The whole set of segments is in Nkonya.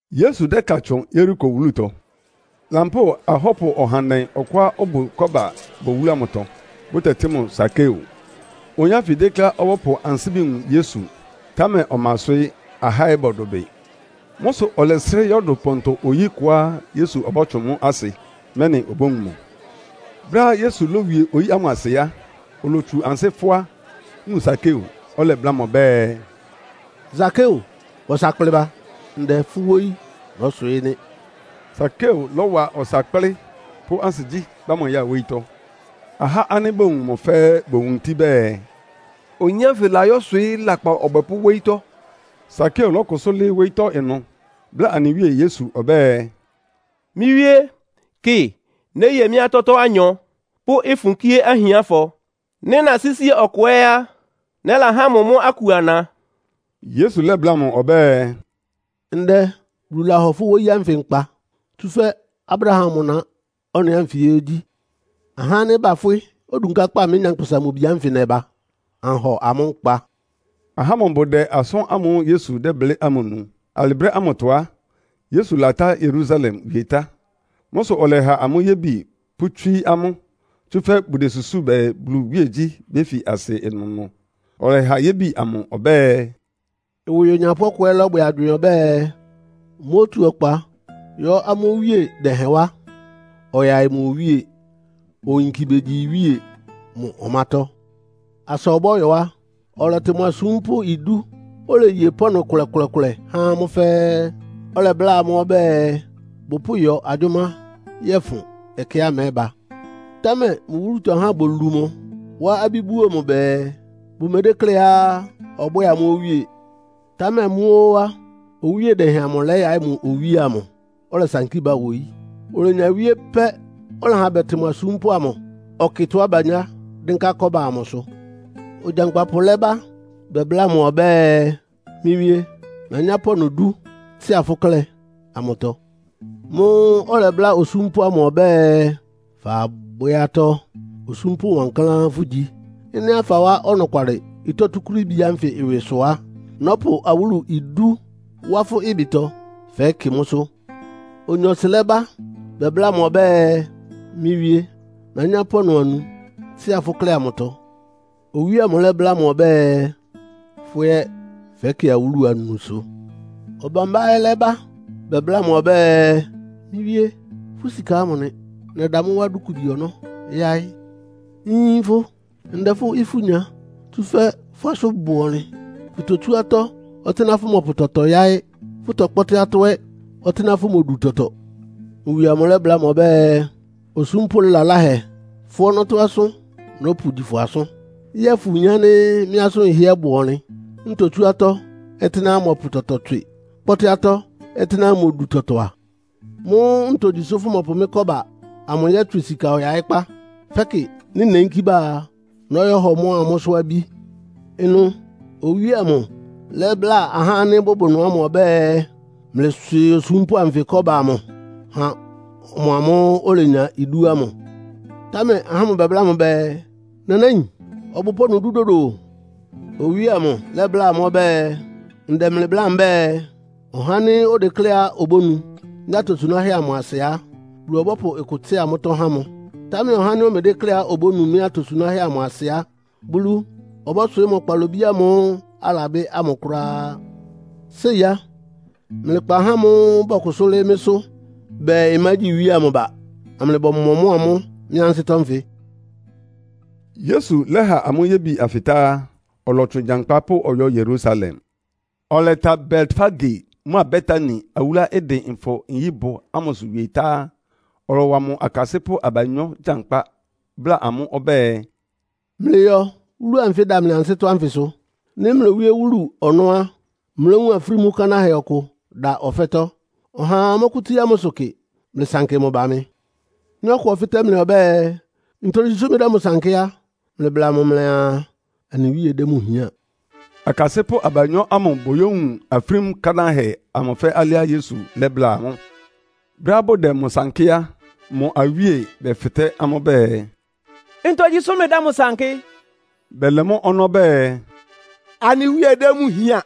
Yesu dɛ́ka tsʋn Yeriko wúlutɔ. Lampóo ahɔ́pʋ ɔhandɛ ɔkʋá ɔbʋ kɔ́ba bʋ wúlu amʋtɔ, bʋtɛtɩ́ mʋ Sakeo. Oyin ánfɩ dékléá ɔbɔ́pʋ ansíbi wun Yesu, támɛ ɔma ɩswɩ́, ahá ɛ́ bɔdʋbɩ. Mʋ́ sʋ ɔlɛsrɩ́ yɔ́dʋ pɔntɔ-oyí kʋá Yesu ɔbɔ́tsʋn mʋ́ asɩ, mɛ́nɩ obówun mʋ. Brɛ́á Yesu lówie oyí ámʋ asɩ á, olotsu ansɩ́ fʋ́á, wun Sakeo, ɔlɛbláa mʋ ɔbɛ́ɛ, “Sakeo, wa ɔsa kplɩ ba. Ndɛ, fʋ́ wóyí nɔ́swɩɩ́ nɩ́.” Sakeo lɔ́wa ɔsa kplɩ́, pʋ́ ansigyí kpá mʋ ya wóyítɔ́. Ahá ánɩ́ bowun mʋ́ fɛ́ɛ́ bowuntí bɛɛ, “Oyin ánfɩ layɔ́swɩɩ́ lakpan ɔbwɛpʋ́ wóyítɔ́.” Sakeo lɔ́kʋsʋ́ lɩ́ɩ́ wóyítɔ́ ɩnʋ, bláa anɩ Wíe Yesu ɔbɛ́ɛ, “Mɩ́ Wíé, kɩ, néye mɩ́ atɔ́tɔ́ anyɔ, pʋ́ ɩfʋn kíé ahiánfɔ. Nɩ́ nasísi ɔkʋ ɛ́ á, nɛ́lahá mʋ mʋ́ aku ana.” Yesu lɛ́bláa mʋ ɔbɛ́ɛ, “Ndɛ Bulu lahɔ wóyí ánfɩ nkpa, tsúfɛ́ Abraham mʋ na ɔ́nɩ ánfɩ ɛ́ gyí. Ahá ánɩ́ bafwɩ́ odunkákpá mɩ́, Nyankpʋsa-Mʋ-Bi ánfɩ nɛba, anhɔ amʋ́ nkpa.” Ahá ámʋ bʋdɛ asʋ́n ámʋ́ʋ́ Yesu dɛ́blɩ́ ámʋ nu. Alɩ brɛ́ ámʋtɔ á, Yesu latá Yerusalem wie tá. Mʋ́ sʋ ɔlɛha amʋ́ yébi pʋ́tswíí amʋ́, tsúfɛ́ bʋdesusúu bɛɛ Bulu iwíegyí béfi asɩ ɩnʋnʋ. Ɔlɛha yébi amʋ ɔbɛ́ɛ, “Ɩwɩ onyapʋ́ ɔkʋ lɔ́bwɛ agywɩɩn ɔbɛ́ɛ, mótu ɔkpa yɔ́ amʋ́ owíe dɛhɛn wá, ɔyaɩ mʋ owíe, oyinki begyi iwíe mʋ ɔmátɔ́. Asa ɔbɔ́yɔ á, ɔlɛtɩ mʋ asúmpʋ́ idú, oleye pɔ́ɔnʋ kʋlɛkʋlɛ há amʋ́ fɛ́ɛ́. Ɔlɛbláa amʋ́ ɔbɛ́ɛ bʋpʋ́yɔ agyʋ́má yɔ́fʋn ɛkɛá mɛ́ba. Támɛ mʋ wúlutɔ ahá bolu mʋ, wá abí buo mʋ bɛɛ, bʋmedékléá ɔbwɛ́ɛ amʋ́ owíe. “Támɛ mʋ́ óó á, owíe dɛhɛn amʋ lɛ́yaɩ́ mʋ iwíe amʋ, ɔlɛsankí ba wóyí. Olenya wíé pɛ́ ɔlɛha bɛtɩ mʋ asúmpʋ́ amʋ, ɔkɩ tɔ́á banyá dɩ́nká kɔ́ba amʋsʋ. Ogyankpapʋ lɛ́ba bɛbláa mʋ ɔbɛ́ɛ, ‘Mɩ́ wíé, nanyá pɔ́ɔnʋ dú tsɩ́a fʋ́ klɛ́ amʋtɔ.’ Mʋ́ʋ́ ɔlɛbláa osúmpʋ́ amʋ ɔbɛ́ɛ, ‘Fabwɛ́ atɔ́. Osúmpʋ́ wankláán fʋ́gyi. Ɩ́nɩá fawá ɔnɔkwalɩ ɩtɔ́ túkúrííbi ánfɩ ɩwɩ sʋ á, nɔ́pʋ awúlu idú wá fʋ́ ɩbɩtɔ, fɛ́kɩ mʋ́sʋ́.’ Onyɔɔsɩ lɛ́ba bɛbláa mʋ ɔbɛ́ɛ, ‘Mɩ́ wíé, nanyá pɔ́ɔnʋ anu tsɩ́a fʋ́ klɛ́ amʋtɔ.’ Owíe amʋ lɛ́bláa mʋ ɔbɛ́ɛ, ‘Fʋ́ ɛ́ fɛ́kɩ awúlu anusʋ.’ “Ɔbambá ɛ́ lɛ́ba bɛbláa mʋ ɔbɛ́ɛ, ‘Mɩ́ wíé, fʋ́ sika ámʋ nɩ. Nɛda mʋ́ wá dúkubi ɔnɔ́ yáɩ́. Nyin fʋ. Ndɛ fʋ́ ifú nya, tsúfɛ́ fʋ́ asʋ́n bʋ ɔnlɩn. Fʋtotsú atɔ́ ɔtɩ́nɛ́á fʋmɔpʋ tɔtɔ yáɩ́, fʋ́tɔkpɔ́tɩ́ atɔ́ ɛ́ ɔtɩ́nɛ́á fʋmodu tɔtɔ.’ Mʋ wie amʋ lɛ́bláa mʋ ɔbɛ́ɛ, ‘Osúmpʋ́ laláhɛ. Fʋ́ ɔnɔ́tɔ́ asʋ́n nɔ́pʋgyi fʋ asʋ́n. Yɛ́ɛ fʋyin ánɩ́ mɩ́ asʋ́n ɩhɩ́ɛ́ bʋ ɔnlɩn, ntotsú atɔ́ ɔtɩ́nɛ́á mmɔpʋ tɔtɔ tswɩ, kpɔ́tɩ́ atɔ́ ɔtɩ́nɛ́á mmodu tɔtɔ a? Mʋ́ ntogyi sʋ́ fʋmɔpʋ mɩ́ kɔ́ba amʋ yɔ́tswɩ sika ɔyaɩ́kpá. Fɛ́kɩ nɩ́ neyínkí ba a, nɔ́yɔhɔ mʋ́a mʋ́sʋ́ abí?’ “Ɩnʋ owíe amʋ lɛ́bláa ahá ánɩ́ bʋbʋ ɩnʋ ɔbɛ́ɛ, ‘Mlɩswɩɩ osúmpʋ́ anfɩ kɔ́ba amʋ ha ɔmʋamʋ́ʋ́ olenya idú ámʋ.’ Támɛ ahá ámʋ bɛbláa mʋ bɛɛ, ‘Nanáin, ɔbʋ pɔ́ɔnʋ dú dodo o!’ Owíe amʋ lɛ́bláa amʋ́ ɔbɛ́ɛ, ‘Ndɛ mlɩ bláa mbɛ́ɛ, ɔhá ánɩ́ odekléá obónu mɩ́ atosunáhɛ́ amʋ asɩ á, Bulu ɔbɔ́pʋ ɩkʋ tsɩ́a mʋ́tɔ́ há mʋ. Támɛ ɔhá ánɩ́ omedékléá obónu mɩ́ atosunáhɛ́ amʋ asɩ á, Bulu ɔbɔ́swɩɩ́ mʋ kpalobí ámʋ́ʋ́ alabɩ́ ámʋ kʋ́ráá. Séi á, mlɩkpa ahá ámʋ́ʋ́ bɔkʋsʋ́ lɩ́ɩ́ mɩ́sʋ́ bɛɛ mmágyi iwíe amʋ ba, amlɩbɔmɔmɔ́ɔ amʋ́ mɩ́ ansɩ́tɔ́ nfɩ!’” Yesu lɛ́ha amʋ́ yébi anfɩ tá á, ɔlɔtsʋn gyankpá pʋ́ ɔyɔ́ Yerusalem. Ɔlɛta Betfage mʋ́a Betania awúluá ɩdɩn Nfɔ-nyíbʋ ámʋsʋ wie tá á, ɔlɔwa mʋ akasɩ́pʋ́ abanyɔ́ gyankpá, bláa amʋ́ ɔbɛ́ɛ, “Mlɩyɔ wúlu anfɩ́ ɩda mlɩ ansɩ́tɔ́ ánfɩsʋ. Nɩ́ mlowíé wúlu ɔnɔ́ á, mlówun afrímú kanáhɛ ɔkʋ da ɔfɛ́tɔ́, ɔhaa mɔ́kʋ́tsíá mʋsʋ kɩ. Mlɩsankɩ mʋ ba mɩ. Nɩ́ ɔkʋ ɔfɩ́tɛ́ mlɩ ɔbɛ́ɛ, ‘Ntogyi sʋ́ mlɩdɛ́ mʋ sankɩ́?’ á, mlɩbla mʋ mlɩaa, ‘Anɩ Wíe dɛ́ mʋ hián.’” Akasɩ́pʋ́ abanyɔ́ ámʋ bɔyówun afrímú kánáhɛ ámʋ fɛ́ alɩá Yesu lɛ́bláa amʋ́. Brɛ́á bʋdɛ mʋ sankɩ́ á, mʋ awíe bɛfɩtɛ́ amʋ́ bɛɛ, “Ntogyi sʋ́ mlɩdɛ́ mʋ sankɩ́?” Bɛlɛ mʋ́ ɔnɔ́ bɛɛ, “Anɩ Wíe dɛ́ mʋ hián.”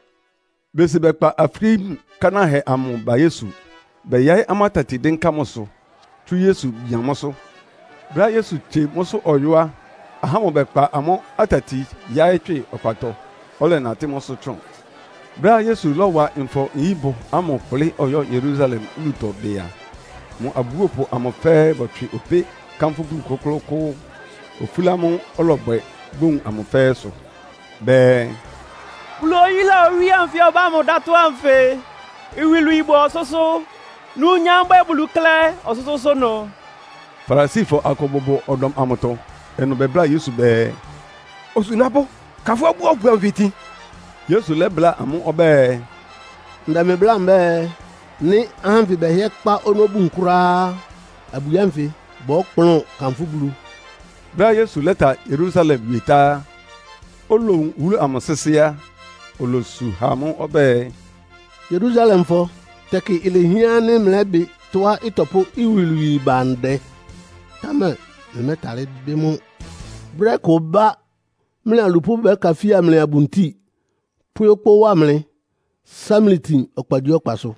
Besi bɛkpa afrímú kánáhɛ amʋ ba Yesu, bɛyaɩ́ amʋ́ atati dɩ́nká mʋsʋ, tsú Yesu bian mʋsʋ. Brɛ́á Yesu tsie mʋsʋ ɔyɔ́ á, ahá ámʋ bɛkpa amʋ́ atati yáɩ́ tswɩ ɔkpatɔ, ɔlɛnatɩ́ mʋ́sʋ́ tsʋn. Brɛ́á Yesu lɔ́wa Nfɔ-nyíbʋ ámʋ kplɩ́ ɔyɔ́ Yerusalem wúlutɔ bɩ a, mʋ abúopʋ amʋ fɛ́ɛ́ bɔtswɩ opé kánfʋ́ Bulu kʋ́klʋ́kʋ́ʋ́, ofúla amʋ́ʋ́ ɔlɔbwɛ, bowun amʋ fɛ́ɛ́ sʋ. Bɛɛ, “Bulu oyúla owíe anfɩ ɔbá mʋ dátɔ́ ánfɩ! Iwilwii bʋ ɔsʋ́sʋ́. Numnyam ɩbwɛ́ɛ Bulu klɛ́ ɔsʋ́sʋ́ʋ́sʋ́ ɩnʋ.” Farisifɔ akʋ bʋbʋ ɔdɔm amʋtɔ. Ɩnʋ bɛbláa Yesu bɛɛ, “Osunápʋ́, ka fʋ́ abúopʋ anfɩ itin!” Yesu lɛ́bláa amʋ́ ɔbɛ́ɛ, “Ndɛ mlɩ bláa mbɛ́ɛ, nɩ́ ahá ánfɩ bɛhɩ́ɛ́ kpá ɔnɔ́ bun kʋ́ráá á, abwi ánfɩ bɔ́kplʋn kanfʋ́ Bulu.” Brɛ́á Yesu lɛ́ta Yerusalem wie tá, olowun wúlu amʋ sɩ́sɩ́ á, olosu ha mʋ́. Ɔbɛ́ɛ, “Yerusalemfɔ, tɛkɩ ilehián ánɩ́ mlɛ́bɩ tɔ́á ɩtɔpʋ́ iwilwii ba ndɛ, támɛ mlɩmɛ́tálɩ́ bɩ́ mʋ́. Brɛ́ kʋ ɩbá, mlɩ alupʋ́ bɛ́kafía mlɩ abuntíi, pwɛ́ okpó wá mlɩ, sá mlɩ tin ɔkpagyíɔkpasʋ.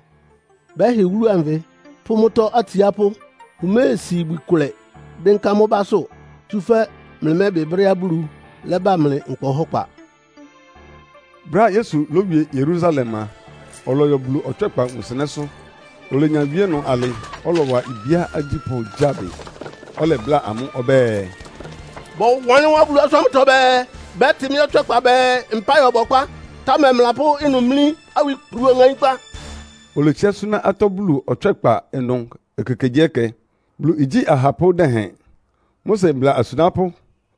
Bɛ́hɩ wúlu anfɩ pʋ́ mʋ́tɔ́ atsiápʋ́. Bʋméesi ibwi kʋlɛ dɩ́nká mʋ́ básʋ́, tsúfɛ́ mlɩmɛ́bɩ brɛ́á Bulu lɛ́ba mlɩ nkpa ɔhɔ́kpa!” Brɛ́á Yesu lówie Yerusalem a, ɔlɔyɔ Bulu ɔtswɛ́kpa wunsɩnɛ́sʋ́. Olenya wíé ɩnʋ alɩ, ɔlɔwa ibíá agyípʋ́ gyáa bɩ. Ɔlɛbláa amʋ́ ɔbɛ́ɛ, “Bɔwanlɩ́n wá Bulu asʋ́n ámʋtɔ bɛɛ, ‘Bɛ́tɩ mɩ́ ɔtswɛ́kpa bɛɛ, mpáɩ ɔbɔkpá.’ Támɛ mlɩlapʋ́ ɩnʋ mlí awikplu ɔŋaínkpá.” Oletsiá súná atɔ́ Bulu ɔtswɛ́kpa ɩnʋ ekekegyíɛkɛ. Bulu igyí ahapʋ́ dɛhɛn, Mose mbla asunápʋ́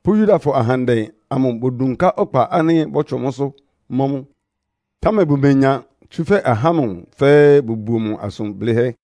pʋ́ Yudafɔ ahandɛ amʋ bodunká ɔkpa ánɩ́ bɔ́tsʋn mʋ́sʋ́ mɔ́ mʋ. Támɛ bʋmenya, tsúfɛ́ ahá ámʋ fɛ́ɛ́ bʋbuo mʋ asʋn blɩ́hɛ́.